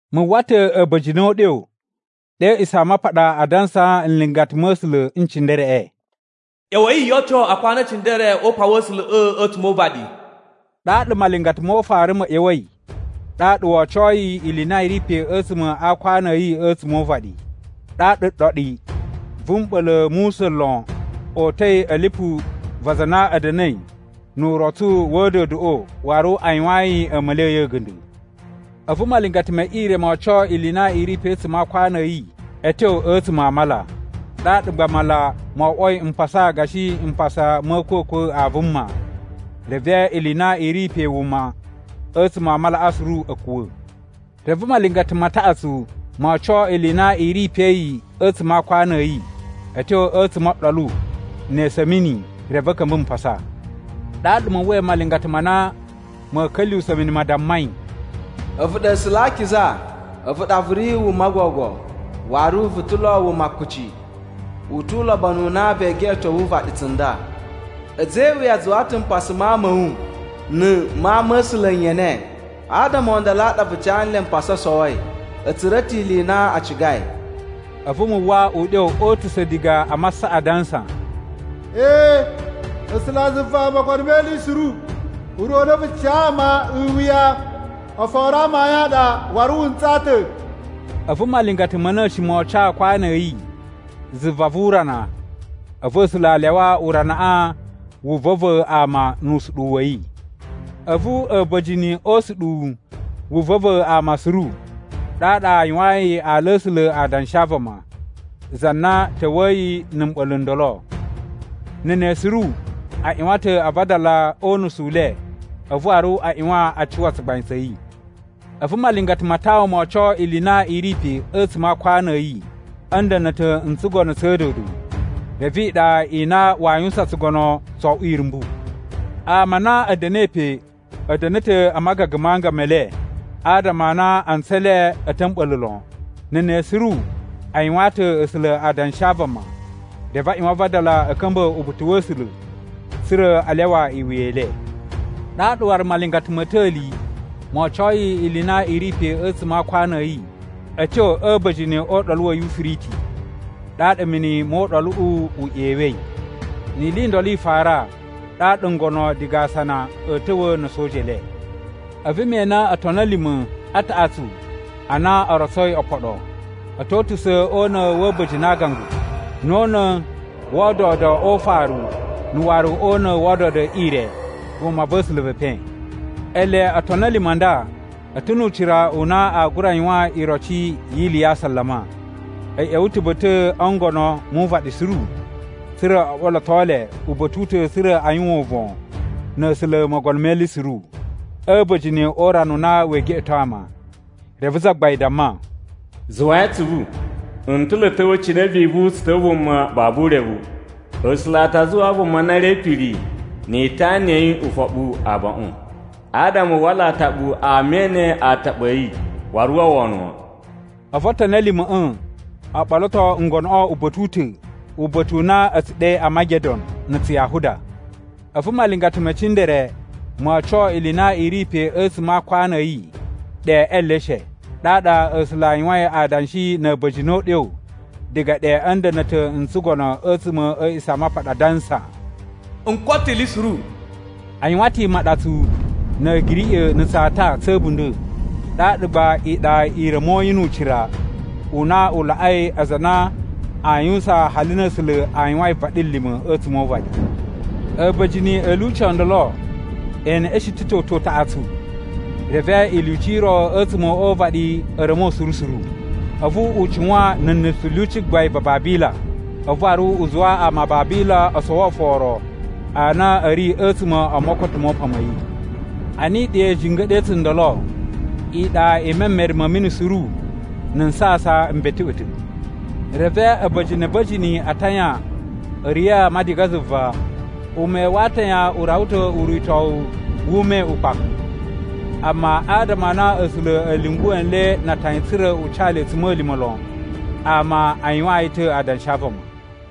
Mu uwwa ta̱ a̱ba̱jini o uɗyo ɗe a̱ A̱a̱ꞌisamapaɗa a dansaa nlingata ma̱ A̱sula̱ n cindereꞌe, “ꞌYa̱wa̱i yo oco akwanu e cindere o upan wa̱ A̱sula̱ꞌa̱ a̱tsuma̱ o uvaɗi.” Ɗaɗa malingata mo ufaru ma̱ ꞌya̱wa̱i ɗaɗa wo ocoi ili i na i ri pe a̱tsuma̱ a aakwanu a̱ yi a̱tsuma̱ o uvaɗi. Ɗaɗa ɗoɗi vu mɓa̱la̱ mu usa̱n lon o uta̱i a̱ lipu va aza a na a̱ da̱na̱i nu urotsu wa̱ a̱a̱dodoꞌo waru a yuwayin a̱a̱ma̱li a̱ yi a̱ga̱nda̱. A̱vu malingata me ire mo oco ili i na i ri pe a̱tsuma̱ a aakwanu a̱ yi a̱ tyo a̱tsuma̱ a mala, ɗaɗa gba mala mo oꞌwoi mpasa gashi mpasa ma̱ a̱a̱kwa̱kwa̱ a vuma, reve ili i na i ri pe wuma a̱tsuma̱ a malaꞌa suru a̱ kuwa̱. Reve malingata ma taꞌatsu mo oco ili i na i ri pe yi a̱tsuma̱ a aakwanu a̱ yi a̱ tyo a̱tsuma̱ o ɗolu ne esu a̱ mini, reve a̱ ka̱mba̱ mpasa. Ɗaɗa mu uwwai malingata ma na ma̱a̱ ka̱lyuwusa̱ mini ma dammai, “A̱vu ɗa A̱sula̱ a Akiza. A̱vu ɗa vu ri wuma gogo, waru vu ta̱ lo wuma kuci! U tu ulobonu u na vee geꞌeto uvaɗi tsunda. A̱za̱ e iwuya a zuwa ta̱ mpasa ma ama a̱ wu na̱ ma ama̱sula̱ n yene. Adama o ndolo a ɗa vu ca nle mpasa o sowoi. A̱ tsura̱ ta̱ ili i na a cigai!” A̱vu mu uwwa uɗyo o utusa̱ diga a masaꞌa adansa: “Ee, A̱sulazuva Mogono me Ili Suru, Ure u na vu tsu ca ama e iwuya oforo amayun a ɗa waru wu ntsaa ta̱.” A̱vu malingata ma̱ na̱shi mo oco aakwanu a̱ yi zuva vu urana, a̱vu A̱sula̱ a lyawa uranaꞌa wu va̱va̱ ama nu usuɗuwu wa̱ yi. A̱vu a̱ba̱jini o usuɗuwu wu va̱va̱ ama suru, ɗaɗa a yuwayin ala a̱ A̱sula̱ adanshi a vama, za na ta̱wa̱yi na̱ mɓa̱la̱ n ndolo. Na̱ ne suru a ꞌyuwan ta̱ a vadala o unusu u le a̱vu waru a ꞌyuwan a cuwa tsugbain tsa̱ yi. A̱vu malingata ma tawun mo oco ili i na i ri pe a̱tsuma̱ a aakwanu a̱ yi a̱ nda̱na̱ta̱ n tsugono tsa̱ a̱a̱dodo, reve iɗa i na waa yuwusan tsugono tso oꞌwo irumbu. Ama a na a̱ da̱na̱i pe a̱ da̱na̱ ta̱ a magaga ma anga me le adama a na antsu e le a̱ ta̱ a̱ mɓa̱la̱ lon. Na̱ ne suru a yuwaan ta̱ A̱sula̱ adanshi a vama reve a ꞌyuwan a vadala a̱ ka̱mba̱ uba̱ta̱ wa̱ A̱sula̱ tsa̱ra̱ a lyawa iwuya i le. Ɗaɗa waru malingata ma̱ ta̱li mo ocoi ili i na i ri pe a̱tsuma̱ a aakwanu a̱ yi a̱ tyo a̱ a̱ba̱jini o Uɗolu wa̱ Yufiriti ɗaɗa mini mo uɗoluꞌu u ꞌyewei. Ni ili i ndolo i fara, ɗaɗa ngono diga asana a̱a̱ ta̱wa̱ na̱ a̱soja e le. A̱vu me ene otoni a̱ lima̱ a taꞌatsu a na o rotsoi opoɗo. A̱ to utusa̱ o una̱ wa̱ a̱ba̱jini a aagangu, na̱ o una̱ wa̱ a̱a̱dodo o ufaru na̱ waru o una̱ wa̱ a̱a̱dodo e ire vumava̱sula̱ ve epen. Ele otoni a̱ lima̱ a nda a̱ ta̱ nu ucira u na aa gura yuwan iroci yi ili ya asalama. A̱ ꞌya̱wa̱ ta̱ ba̱ta̱ o ngono mu uvaɗi suru, tsa̱ra̱ o ɓoloto le uba̱ta̱ u ta̱ tsa̱ra̱ a yuwan uvon na̱ A̱sula̱ Mogono me Ili Suru a̱ a̱ba̱jini o urana u na wee geꞌeto ama. Reve Zagbain damma, “Zuwai atsuvu! N ta̱ lo a̱ ta̱wa̱ cine vivu tsu ta̱wa̱ vuma babu urevu. A̱sula̱ a ta zuwaa vuma na ri e ipiri ni itana ya̱ yi ufoɓu abaꞌun, adama u wala ataɓu ama e ene ataɓu a̱ yi, wu uwwa wono wan.” A̱vu otoni a̱ lima̱ꞌa̱ o ɓoloto ngonoꞌo uba̱ta̱ u ta̱, uba̱ta̱ u na a̱ tsu ɗe Amagedon na̱ Tsuyahuda. A̱vu malingata me cindere mo oco ili i na i ri pe a̱tsuma̱ a aakwanu a̱ yi ɗe e eleshe. Ɗaɗa A̱sula̱ a yuwain adanshi na̱ a̱ba̱jini o uɗyo diga ɗe a̱ nda̱na̱ta̱ n tsugono a̱tsuma̱ a̱ A̱a̱ꞌisamapaɗa, adansa, “N koto ta̱ ili suru.” A yuwan ta̱ imaɗatsu na̱ a̱giriꞌa̱ na̱ tsata tsa̱ a̱bunda̱, ɗaɗa gba iɗa i ra̱moi nu ucira u na u laꞌai aza a na aa yuwusan hali na A̱sula̱ a yuwain vaɗilima̱ a̱tsuma̱ o uvaɗi. A̱ba̱jini a̱ lyuci o ndolo e neꞌeshen ta̱ toto utaꞌatsu, reve ilyuci i ro a̱tsuma̱ o uvaɗi a̱ ra̱mo suru suru. A̱vu u cuwan na̱ nusu lyuci gbain va Babila, a̱vu waru u zuwa ama a Babila o sowo oforo a na a̱ ri a̱tsuma̱ o mokoto mo upan ma̱ yi. Ana iɗa i jinga̱ɗa̱i tsundolo, iɗa i memere ma̱ mini suru na̱ nsasan m beteꞌwe ta̱. Reve a̱ba̱jini a̱ba̱jini a atayan a̱ riya̱a̱ ama diga zuva. Ume wa atayan u rawa ta̱ uritowu wu ume ukpaku. Amma adama a na A̱sula̱ a̱ lyunguwa̱ nle na atayan tsa̱ra̱ u ca le a̱tsuma̱lima̱ lon ama a yuwaan yi ta̱ adanshi a vama.